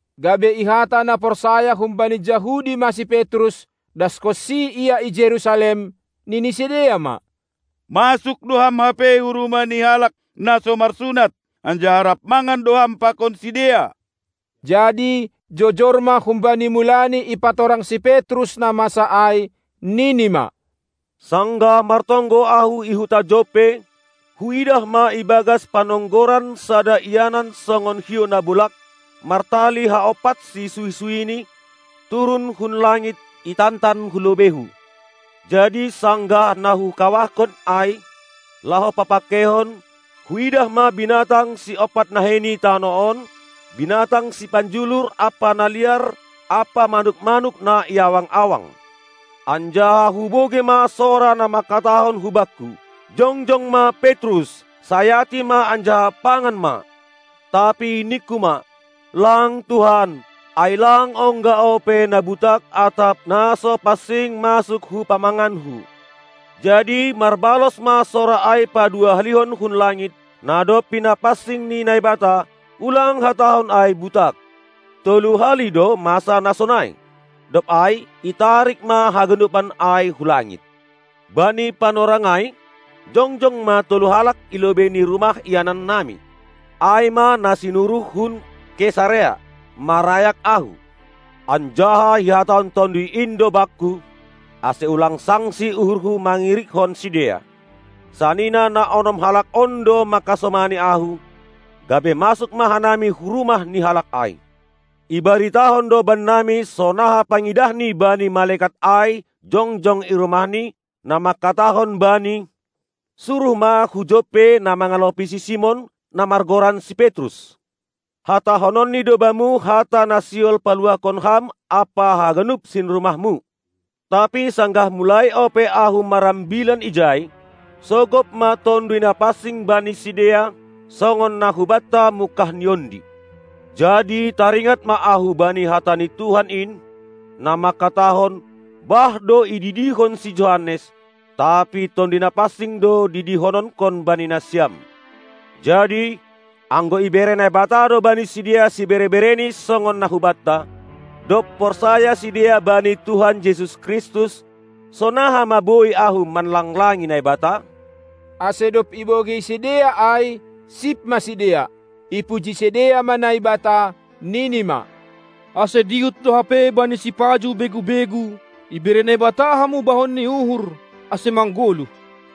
Gabe ihata na porsaya humbani Jahudi ma si Petrus, daskonsi ia i Jerusalem, nini sidea ma: Masuk do ham hape hu rumah ni halak na so marsunat, anjaha rap mangan do ham pakon sidea! Jadi jojor ma humbani mulani ipatorang si Petrus na masa ai, nini ma: Sanggah martonggo ahu i huta Joppe, huidah ma ibagas panonggoran sada ianan songon hiou na bolag, martali haompatsi suhi-suhini, turun hun langit, itantan hu lobeihu. Jadi sanggah na hukawahkon ai, laho papangkeihon, huidah ma binatang siompat nahei ni tanoh on, binatang sipanjulur ampa na liar ampa manuk-manuk na i awang-awang. Anjaha hubogei ma sora na mangkatahon hubakku: Jongjong ma, Petrus, sayati ma anjaha pangan ma! Tapi ningku ma: Lang, Tuhan! Ai lang ongga ope na butak atap na so pansing masuk hu pamanganku. Jadi marbalos ma sora ai paduahalihon hun langit: Na dob pinapansing ni Naibata, ulang hatahon ai butak! Tolu hali do masa na sonai, dob ai itarik ma haganupan ai hu langit. Bani panorang ai jongjong ma tolu halak i lobei ni rumah ianan nami, ai ma na sinuruh hun Kesarea, marayak ahu. Anjaha ihatahon Tonduy in do bakku, ase ulang sangsi uhurhu mangirikkon sidea. Sanina na onom halak on do mangkasomani ahu, gabe masuk ma hanami hu rumah ni halak ai. Ibaritahon do bannami sonaha pangidahni bani malekat ai jongjong i rumahni, na mangkatahon bani: Suruh ma hu Joppe na mangalopi si Simon, na margoran si Petrus. Hatahononni do bamu hata na sihol paluahkon ham ampa haganup sinrumahmu! Tapi sanggah mulai ope ahu marambilan ijai, sogop ma Tonduy Napansing bani sidea, songon na hubanta mungkahni ondi. Jadi taringat ma ahu bani hata ni Tuhan in, na mangkatahon: Bah do ididihon si Johannes, tapi Tonduy Napansing do didihononkon bani nasiam! Jadi, anggo ibere Naibata do bani sidea sibere-bereni songon na hubanta, dob porsaya sidea bani Tuhan Jesus Kristus, sonaha ma boi ahu manlanglangi Naibata? Ase dob ibogei sidea ai, sip ma sidea. Ipuji sidea ma Naibata, nini ma: Ase dihut do hape bani sipajuh begu-begu ibere Naibata hamubahon ni uhur, ase manggoluh.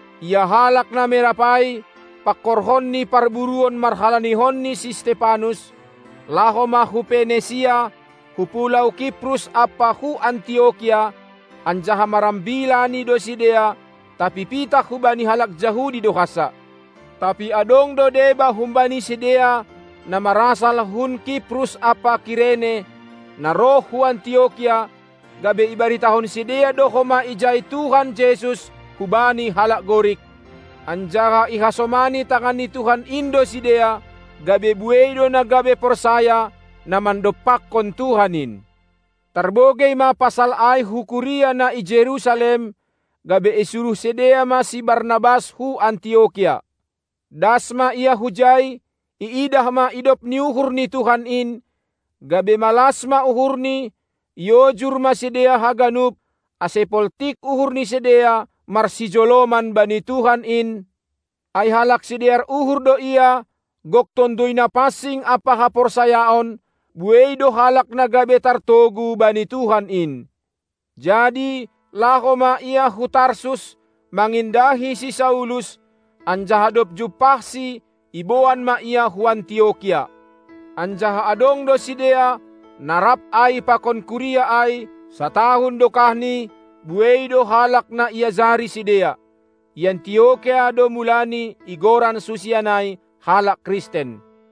Ia halak na merap ai, pangkorhon ni parburuon marhalanihon ni si Stepanus, laho ma hu Penesia, hu pulou Kiprus ampa hu Antiokia, anjaha marambilani do sidea, tapi pitah hubani halak Jahudi do hansa. Tapi adong do deba humbani sidea, na marasal hun Kiprus ampa Kirene, na roh hu Antiokia, gabe ibaritahon sidea do homa ijai Tuhan Jesus hubani halak Gorik. Anjaha ihasomani tangan ni Tuhan in do sidea; gabe buei do na gabe porsaya, na mandompakkon Tuhan in. Tarbogei ma pasal ai hu kuria na i Jerusalem, gabe isuruh sidea ma si Barnabas hu Antiokia. Das ma ia hujai, iidah ma idop ni uhur ni Tuhan in, gabe malas ma uhurni; iojur ma sidea haganup, ase poltik uhur ni sidea marsijoloman bani Tuhan in, ai halak sidear uhur do ia, gok Tonduy Napansing ampa haporsayaon; buei do halak na gabe tartogu bani Tuhan in. Jadi laho ma ia hu Tarsus, mangindahi si Saulus, anjaha dob jumpahsi iboan ma ia hu Antiokia. Anjaha adong do sidea, na rap ai pakon kuria ai, satahun dokahni; buei do halak na iajari sidea. I Antiokia do mulai igoran susian ai halak Kristen.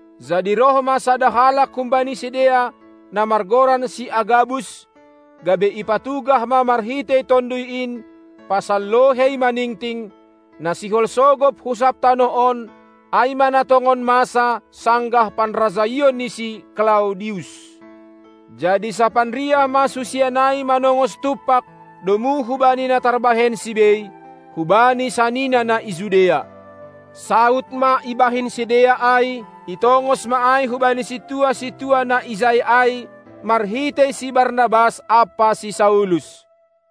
Jadi roh ma sada halak humbani sidea, na margoran si Agabus, gabe ipatugah ma marhitei Tonduy in pasal lohei maningting, na sihol sogop hu sab tanoh on, ai ma na tongon masa sanggah panrajaion ni si Klaudius. Jadi sapanriah ma susian ai manongos tumpak, domu hubani na tarbahensi bei, hubani sanina na i Judea. Saud ma ibahen sidea ai, itongos ma ai hubani sintua-sintua na ijai ai marhitei si Barnabas ampa si Saulus.